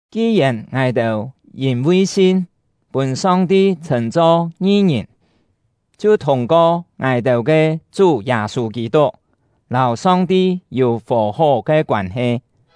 Ki-yèn ngài-têu yîn-vi sin pûn Song-ti chhṳ̂n-cho ngi-ngìn, chhiu thûng-ko ngài-têu ke Chú Yâ-sû Kî-tuk lâu Song-ti yû fò-hó ke koân-he.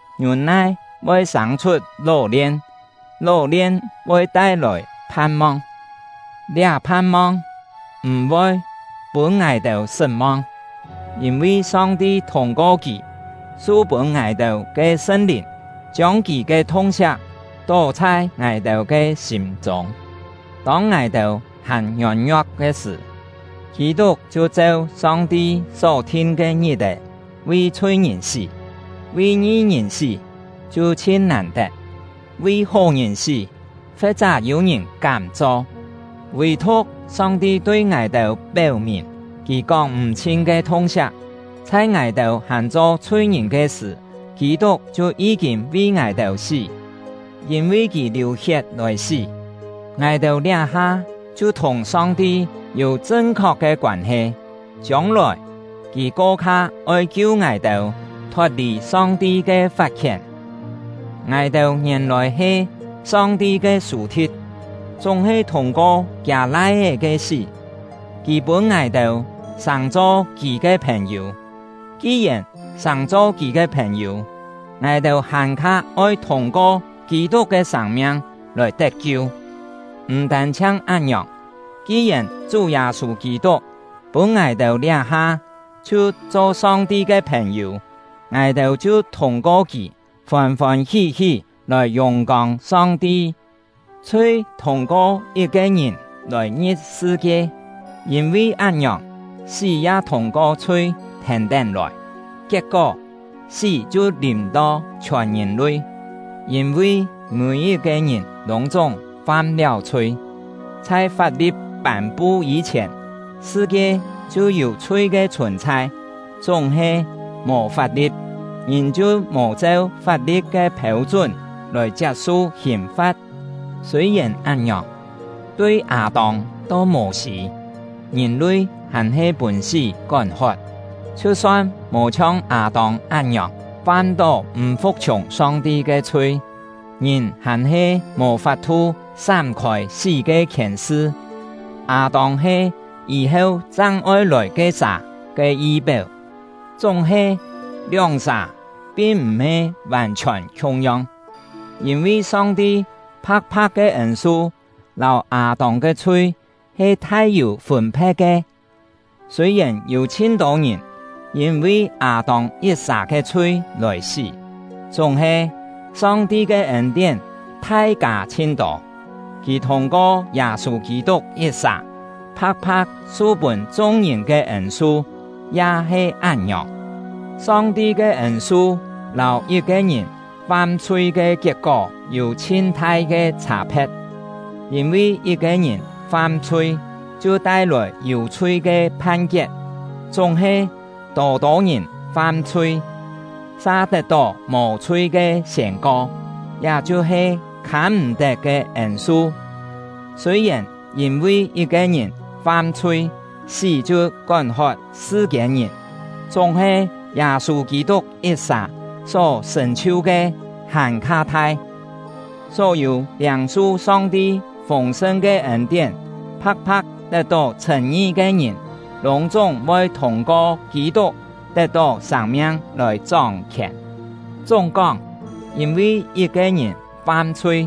ngiûn-nai voi sâng-chhut ló-lien, ló-lien voi tai-lòi phan-mong. Liá phan-mong m̀-voi pûn ngài-têu sṳt-mong; yîn-vi Song-ti thûng-ko Kì su pûn ngài-têu ke Sṳn-Lìn, chiông Kì ke thung-siak tó chhai ngài-têu ke sîm-chûng. Tông ngài-têu hàn ngiôn-ngio̍k ke sṳ̀, Kî-tuk chhiu cheu Song-ti só-thin ke ngit-è vi chhui-ngìn sí. Vi ngi-ngìn sí chhiu chhin nàn-tet; vi hó-ngìn sí, fe̍t-chá yû-ngìn kám cho. Vì-thu̍k Song-ti tui ngài-têu péu-mìn Kì kóng-m̀-chhin ke thung-siak: Chhai ngài-têu hàn cho chhui-ngìn ke sṳ̀, Kî-tuk chhiu yí-kîn vi ngài-têu sí! Yîn-vi kì liù-hiet lòi sí, ngài-têu liá-ha chhiu thùng Song-ti yû chṳn-khok ke koân-he; chiông-lòi, kì ko-kha oi kiu ngài-têu thot-lì Song-ti ke fat-khién. Ngài-têu ngièn-lòi he Song-ti ke sù-thi̍t; chúng-he thûng-ko Kiâ Lai-é ke sí, Kì pûn ngài-têu sàng-cho Kì ke phèn-yû. Ki-yèn sàng-cho Kì ke phèn-yû, ngài-têu hàn-kha oi thûng-ko Kî-tuk ke sâng-miang lòi tet-kiu! M̀ tân-chhiang án-ngiòng, ki-yèn Chú Yâ-sû Kî-tuk pûn ngài-têu liá-ha chhiu cho Song-ti ke phèn-yû, ngài-têu chhiu thûng-ko kì fôn-fôn hí-hí lòi yùng-kông Song-ti. Chhui thûng-ko yit-ke ngìn lòi ngi̍p sṳ-kie, yîn-vi án-ngiòng, sí ya thûng-ko chhui thèn-tén lòi; kiet-kó, sí chhiu lìm-to chhiòn ngìn-lui, yîn-vi mî-yit-ke ngìn lûng-chúng fam-liáu chhui. Chhai fap-li̍t pân-pu yî-chhièn, sṳ-kie chhiu yû chhui ke chhùn-chhai; chúng-he, mò fap-li̍t, ngìn chhiu mò cheu fap-li̍t ke phêu-chún lòi chiap-su hìn-fa̍t. Sûi-yèn án-ngiòng, tui Â-tông to Mô-sî, ngìn-lui hàn-he pûn sí kón-hot, chhiu-son mò chhiong Â-tông án-ngiòng fam-tó m̀ fu̍k-chhiùng Song-ti ke chhui, ngìn hàn-he mò fap-thu sám-khôi sí ke khièn-sṳ. Â-tông he yî-heu chang oi lòi ke-sà ke yi-péu. Chúng-he, lióng-sà pin m̀-he vàn-chhiòn khiung-yong, yîn-vi Song-ti pha̍k-pha̍k ke ên-su lâu Â-tông ke chhui he thai-yû fûn-phe̍t ke. Sûi-yèn yû chhin-tô ngìn yîn-vi Â-tông yit-sà ke chhui lòi sí; chúng-he, Song-ti ke ên-tién thai kâ chhin tô. Kì thûng-ko Yâ-sû Kî-tuk yit-sà pha̍k-pha̍k su pûn chung-ngìn ke ên-su ya he án-ngiòng. Song-ti ke ên-su lâu yit-ke ngìn fam-chhui ke kiet-kó yû chhin-thai ke chhâ-phe̍t. Yîn-vi yit-ke ngìn fam-chhui, chhiu tai-lòi “Yû-chhui” ke phan-kiet; chúng-he, tô-tô ngìn fam-chhui, sa tet-tó “Mò-chhui” ke siên-ko, liá chhiu-he khâm-m̀-tet ke ên-su! Sûi-yèn yîn-vi yit-ke ngìn fam-chhui, sí chhiu kón-hot sṳ-kiên-ngìn, chúng-he Yâ-sû Kî-tuk yit-sà só sṳ̀n-chhiu ke hàn-kha thai! Só-yû liâng-su Song-ti fûng-sṳn ke ên-tién, pha̍k-pha̍k tet-tó chhṳ̂n-ngi ke ngìn, lûng-chúng voi thûng-ko Kî-tuk tet-tó sâng-miang lòi chóng-khièn. Chúng-kóng, yîn-vi yit-ke ngìn fam-chhui,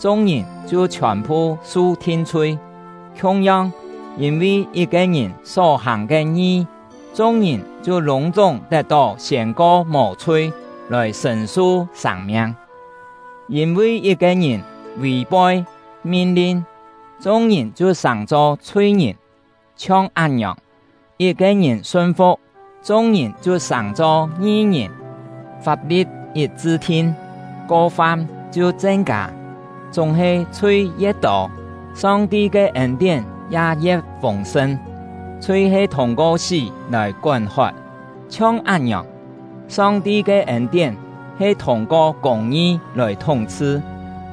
chung-ngìn chhiu chhiòn-phu su thin-chhui; khiung-yong, yîn-vi yit-ke ngìn só-hàng ke ngi, chung-ngìn chhiu lûng-chúng tet-tó siên-ko mò-chhui lòi sṳ̀n-su sâng-miang. Yîn-vi yit-ke ngìn vì-phoi min-lin, chung-ngìn chhiu sàng-cho chhui-ngìn; chhiong án-ngiòng, yit-ke ngìn sun-fu̍k, chung-ngìn chhiu sàng-cho ngi-ngìn. Fap-li̍t yit chṳ-thin, ko-fam chhiu chen-kâ; chúng-he chhui ye̍t tô, Song-ti ke ên-tién ya ye̍t fûng-sṳn. Chhui he thûng-ko sí lòi kón-hot, chhiong án-ngiòng, Song-ti ke ên-tién he thûng-ko kûng-ngi lòi thúng-chhṳ,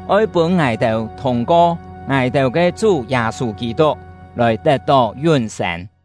oi pûn ngài-têu thûng-ko ngài-têu ke Chú Yâ-sû Kî-tuk lòi tet-tó yún-sên.